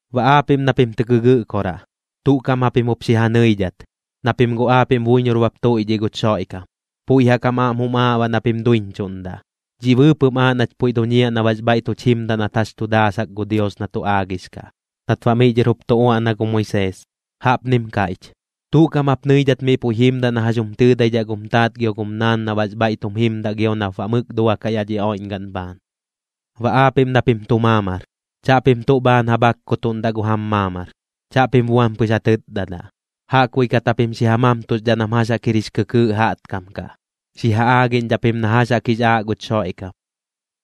Baꞌ aapiꞌm na pim tɨ gɨgɨꞌkoraꞌ, tuꞌ kaꞌm japim jup xi ja nɨidhat, na pim guꞌ aapiꞌm buiñor bap tuiꞌdhiꞌ guch Xoiꞌkam, puiꞌ jaꞌk jam aꞌm jum aaꞌ baꞌ na pim duiñchuꞌndaꞌ. Dhiꞌ bɨɨpɨꞌm aaꞌ nach puiꞌ duñiaꞌ na baꞌx bhaiꞌ tuch jimdaꞌ nat jax tu daasak gu Dios na tu aagix kaꞌ, nat baꞌ miꞌ dhɨr jup tu uaꞌna gu Moisees, jaꞌpnim kaiꞌch: “Tuꞌ kaꞌm jap nɨidhat miꞌ puiꞌ jimdaꞌ na jax jum tɨɨdaidhaꞌ gum taat gio gum naan na baꞌx bhaiꞌ tum jimdaꞌ gio nap baꞌ mɨk duakaꞌ yaꞌ dhi oiꞌñgaꞌn bhaan.” Baꞌ aapiꞌm na pim tu maamar, chaꞌpim tuꞌ bhaan ja bhakkutuꞌndaꞌ gu jam maamar, chaꞌpim buam pɨx ja tɨtdadaꞌ. Jaꞌkbuiꞌ kat japim xi ja mamtuxdhaꞌ nam jax jaꞌk jir jix kɨkɨɨꞌ jaꞌtkam kaꞌ, xi ja aagiꞌñdhaꞌ pim na jax jaꞌk jix aaꞌ guch Xoiꞌkam.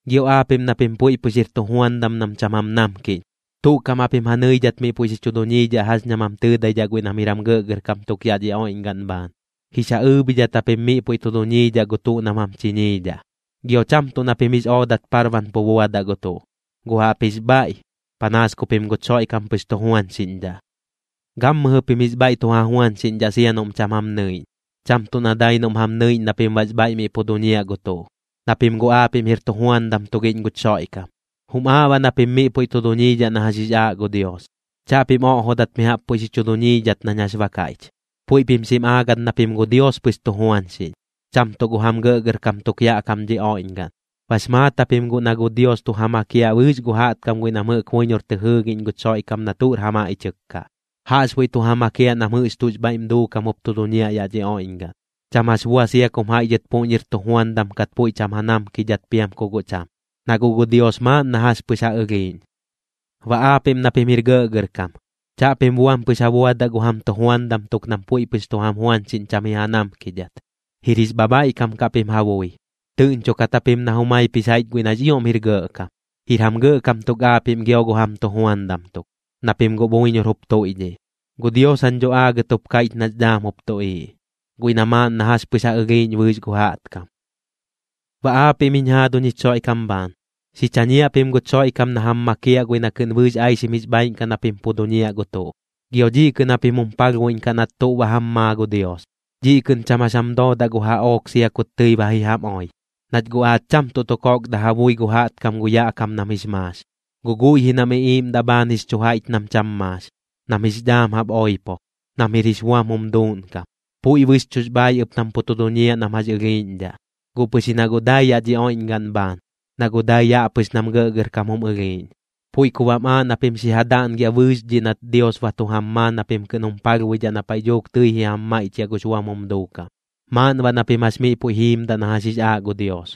Gio aapiꞌm na pim puiꞌ pɨx jir tujuandam nam cham jam namkiꞌñ, tuꞌ kaꞌm japim ja nɨidhat miꞌ puiꞌ xi chu duñiidhaꞌ jax ñam jam tɨɨdaidhaꞌ guiꞌ nam jir jam gɇꞌgɇrkam tuk yaꞌ dhi oiꞌñgaꞌn bhaan, jix ja ɨɨbhidhat japim miꞌ puiꞌ tu duñiidhaꞌ gu tuꞌ nam jam chiñiidhaꞌ. Gio cham tuꞌ na pim jix oodat parban pu buadaꞌ gu tuꞌ, guꞌ jaꞌpjix bhaiꞌ, panaas ku pim guch Xoiꞌkam pɨx tujuañxiꞌñdhaꞌ. Gammɨjɨ pim jix bhaiꞌ tu ja juañxiꞌñdhaꞌ sia noꞌm cham jam nɨiꞌñ, cham tuꞌ na dai noꞌm jam nɨiꞌñ na pim baꞌx bhaiꞌ miꞌ pu duñiaꞌ gu tuꞌ, na pim guꞌ aapiꞌm jir tujuandam tugiꞌñ guch Xoiꞌkam, jum aaꞌ baꞌ na pim miꞌ puiꞌ tu duñiidhaꞌ na jax jix aaꞌ gu Dios. Chaꞌpim oꞌjodat mi jaꞌp puiꞌ xi chu duñiidhat nañ jax ba kaiꞌch. Puiꞌ pim pɨx xim aagat na pim gu Dios pɨx tu juañxiꞌñ, cham tuꞌ gu jam gɇꞌgɇrkam tuk yaꞌ kam dhi oiꞌñgaꞌn. Bax maat japim guꞌ na gu Dios tu ja makiaꞌ bɨɨx gu jaꞌtkam guiꞌ nam jɨꞌk buiñor tɨ jɨɨgiꞌñ guch Xoiꞌkam na tuꞌr ja maiꞌchɨk kaꞌ, jaꞌxbuiꞌ tu ja makiaꞌ nam jɨꞌx tuꞌx bhaiꞌm duukam jup tu duñiaꞌ yaꞌ dhi oiꞌñgaꞌn, cham jax bua sia kum jaiꞌ dhɨt puꞌñir tujuandam kat puiꞌ cham ja namkidhat piam ku guꞌ cham, na guꞌ gu Dios maaꞌn na jax pɨx ja ɨlhiiꞌñ. Baꞌ aapiꞌm na pim jir gɇꞌgɇrkam, chaꞌpim buam pɨx ja buadaꞌ gu jam tujuandam tuk nam puiꞌ pɨx tu jam juañxiꞌñ cham ji ja namkidhat, jir jix bhabhaiꞌkam kaꞌ pim ja bui. Tɨꞌñchokat japim na jumaip jix jaiꞌch guiꞌ nax ioꞌm jir gɇꞌkam, jir jam gɇꞌkam tuk aapiꞌm gio gu jam tujuandam tuk, na pim guꞌ buiñor jup tuiꞌdhiꞌ. Gu Dios jañ dho aagɨt jup kaiꞌch nax dhaam jup tuꞌiiꞌ, guiꞌ na maaꞌn na jax pɨx ja ɨlhiiꞌñ bɨɨx gu jaꞌtkam. Baꞌ aapiꞌm jiñ jaaduñ jich Xoiꞌkam bhaan, xi chañiaꞌ pim guch Xoiꞌkam na jam makiaꞌ guiꞌ na kɨꞌn bɨɨx aixim jix bhaaiꞌn kaꞌ na pim pu duñiaꞌ gu tuꞌ. Gio dhiꞌ kɨꞌn japim jum palhbuiꞌñkaꞌ nat tuꞌ ba tu jam maa gu Dios, dhiꞌ kɨꞌn cham jax jam doodaꞌ gu jaꞌook sia kut tɨi ba ji jam oi. Nach guꞌ aach cham tuꞌ tu kokdaꞌ ja bui gu jaꞌtkam gu yaꞌ kam nam jix maax, guꞌ guiꞌ ji nam iꞌiiꞌmdaꞌ bhaan jix chu jaiꞌch nam cham maax, nam jix dhaam jaꞌp oipo, nam jir jix buam jum duuꞌnkam. Puiꞌ bɨxchuꞌx bhaaiꞌ ɨp nam pu tu duñiaꞌ nam jax ɨlhiiꞌñdhaꞌ, guꞌ pɨx ji na guꞌ dai yaꞌ dhi oiꞌñgaꞌn bhaan, na guꞌ dai yaꞌ pɨx nam gɇꞌgɇrkam jum ɨlhiiꞌñ. Puiꞌ ku baꞌm aaꞌ na pim xi ja daꞌngiaꞌ bɨɨx dhiꞌ nat Dios ba tu jam maa na pim kɨꞌn jum palhbuidhaꞌ na paiꞌ dhuuk tɨi ji jam maiꞌchiaꞌ gux buam jum duukam. Maaꞌn baꞌ na pim jax miꞌ puiꞌ jiimdaꞌ na jax jix aaꞌ gu Dios,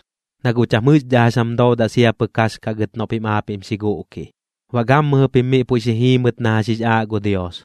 na guꞌ cham jɨꞌxdhaꞌ jax jam doodaꞌ sia pɨk jax kaꞌ gɨt noꞌ pim aapiꞌm xi guꞌkiꞌ. Baꞌ gammɨjɨ pim miꞌ puiꞌ xi jiimɨt na jax jix aaꞌ gu Dios,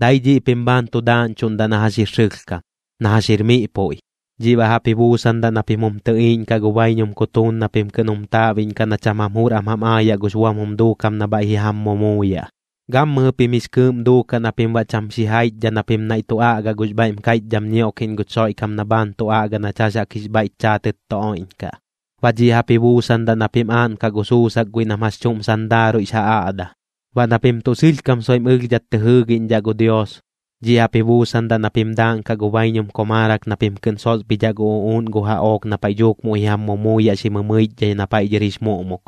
dai dhiꞌ pim bhaan tu daaꞌñchuꞌndaꞌ na jax jir sɨlhkam, na jax jir miꞌ puiꞌ. Dhiꞌ baꞌ jaꞌp ji buusandaꞌ na pim jum tɨꞌiiꞌñkaꞌ gu baiñum kutuun na pim kɨꞌn jum taaꞌbiꞌñkaꞌ na cham jam jur am jam aayaꞌ gux buam jum duukam na bhaiꞌ ji jam mumuuyaꞌ. Gammɨjɨ pim jix kɨɨꞌm duukaꞌ na pim baꞌ cham xijaichdhaꞌ na pim naiꞌ tu aꞌgaꞌ gux bhaiꞌm kaiꞌchdham ñioꞌkiꞌñ guch Xoiꞌkam na bhaan tu aꞌga nach jax jaꞌk jix bhaiꞌch chaatɨt tu oiꞌñkaꞌ. Baꞌ dhiꞌ jaꞌp ji buusandaꞌ na pim aaꞌnkaꞌ gu sussak guiꞌ nam jax chuꞌm sandaaruiꞌx ja aꞌda. Baꞌ na pim tuꞌ sɨlhkam soiꞌm ɨlhdhat tɨ jɨɨgiꞌñdhaꞌ gu Dios, dhiꞌ jaꞌp ji buusandaꞌ na pim daaꞌnkaꞌ gu baiñum komaarak na pim kɨꞌn sosbhidhaꞌ gu uꞌuuꞌn gu jaꞌook na paiꞌ dhuuk muiꞌ ji jam mumuuyaꞌ xi mɨmɨichdhai na paiꞌ dhɨr jix muꞌmuk.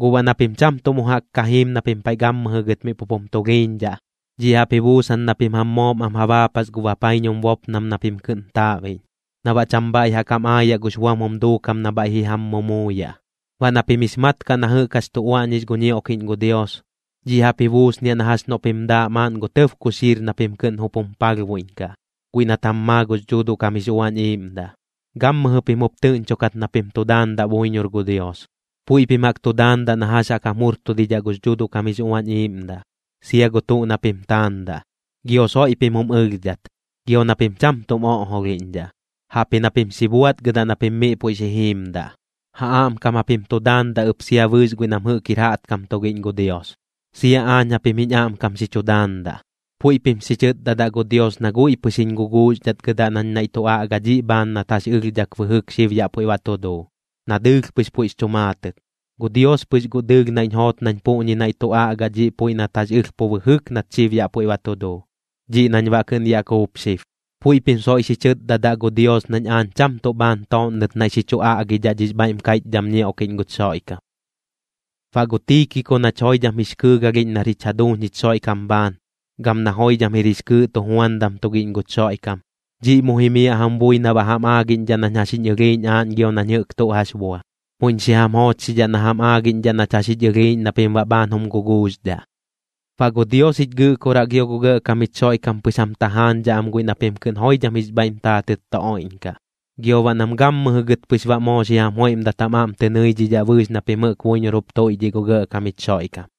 Guꞌ baꞌ na pim cham tuꞌ mu jaꞌk ka jiim na pim paiꞌ gammɨjɨ gɨt miꞌ pup jum tulhiiñdhaꞌ, dhiꞌ jaꞌp ji buusan na pim jam moom am ja baapas gu bapaiñum bopnam na pim kɨꞌn taaꞌbiꞌñ, na baꞌ cham bhaiꞌ jaꞌk jam aayaꞌ gux buam jum duukam na bhaiꞌ ji jam mumuuyaꞌ. Baꞌ na pim jix mat kaꞌ na jɨꞌk jax tu uaꞌñix gu ñioꞌkiꞌñ gu Dios, dhiꞌ jaꞌp ji buusniaꞌ na jax noꞌ pim daaꞌ maaꞌn gu tɇb kuxiir na pim kɨꞌn jup jum palhbuiꞌñkaꞌ, guiꞌ nat jam maa gux Dhuuduꞌ kam jix Uañ Iiꞌmdaꞌ. Gammɨjɨ pim jup tɨꞌñchokat na pim tu daandaꞌ buiñor gu Dios, puiꞌ pim jaꞌk tu daandaꞌ na jax jaꞌk jam jurtudidhaꞌ gux Dhuuduaꞌ kam jix Uañ Iiꞌmdaꞌ, sia gu tuꞌ na pim taandaꞌ. Gio soiꞌ pim jum ɨlhdhat, gio na pim cham tuꞌm oꞌjolhiꞌñdhaꞌ, jaꞌpji na pim xi buaꞌtgɨdaꞌ na pim miꞌ puiꞌ xi jiimdaꞌ. Ja aꞌmkam japim tu daandaꞌ ɨp sia bɨɨx guiꞌ nam jɨꞌk jir jaꞌtkam tugiꞌñ gu Dios. Sia aañ japim jiñ aꞌmkam xi chu daandaꞌ, puiꞌ pim xi chɨtdadaꞌ gu Dios na guiꞌ pɨx jiñ guguuxdhatgɨdaꞌ nañ naiꞌ tu aꞌga dhiꞌ bhaan nat jax ɨlhdhak bɨjɨk xib yaꞌ puiꞌ ba tu duu, na dɨɨlh pɨx puiꞌx chu maatɨt. Gu Dios pɨx guꞌ dɨɨlh naiꞌñ joot nañ puꞌñi naiꞌ tu aꞌgaꞌ dhiꞌ puiꞌ nat jax ɨlh pu bɨjɨk nat xib baꞌ yaꞌ puiꞌ ba tu duu, dhiꞌ nañ baꞌ kɨꞌn yaꞌ kuup xib. Puiꞌ pim soiꞌ xi chɨtdadaꞌ gu Dios nañ aañ cham tuꞌ bhaan tooꞌnnɨt naiꞌ xi chu aꞌgidhaꞌ dhix bhaiꞌm kaiꞌchdham ñioꞌkiꞌñ guch Xoiꞌkam. Baꞌ gu Tiikiko nach joidham jix kɨɨgalhiꞌñ nar jich jaduuñ jich Xoiꞌkam bhaan, gam na joidham jir jix kɨɨꞌ tujuandam tugiꞌñ guch Xoiꞌkam, dhiꞌ mu jimiaꞌ jam bui na baꞌ jam aagiꞌñdhaꞌ nañ jax jiñ ɨlhiiꞌñ aañ gio nañ jɨꞌk tuꞌ jax bua. Muiꞌñ xi jam joochxidhaꞌ na jam aagiꞌñdhaꞌ nach jax jich ɨlhiiꞌñ na pim baꞌ bhaan jum guguuxdhaꞌ. Baꞌ gu Dios jich Gɨꞌkoraꞌ gio gu Gɇꞌkam jich Xoiꞌkam pɨx jam tajaañdhaꞌ am guiꞌ na pim kɨꞌn joidham jix bhaiꞌm taatɨt tu oiꞌñkaꞌ, gio baꞌ nam gammɨjɨ gɨt pɨx baꞌ moo xi jam joiꞌmdat jam aꞌm tɨ nɨidhidhaꞌ bɨɨx na pim jɨꞌk buiñor jup tuiꞌdhiꞌ gu Gɇꞌkam jich Xoiꞌkam.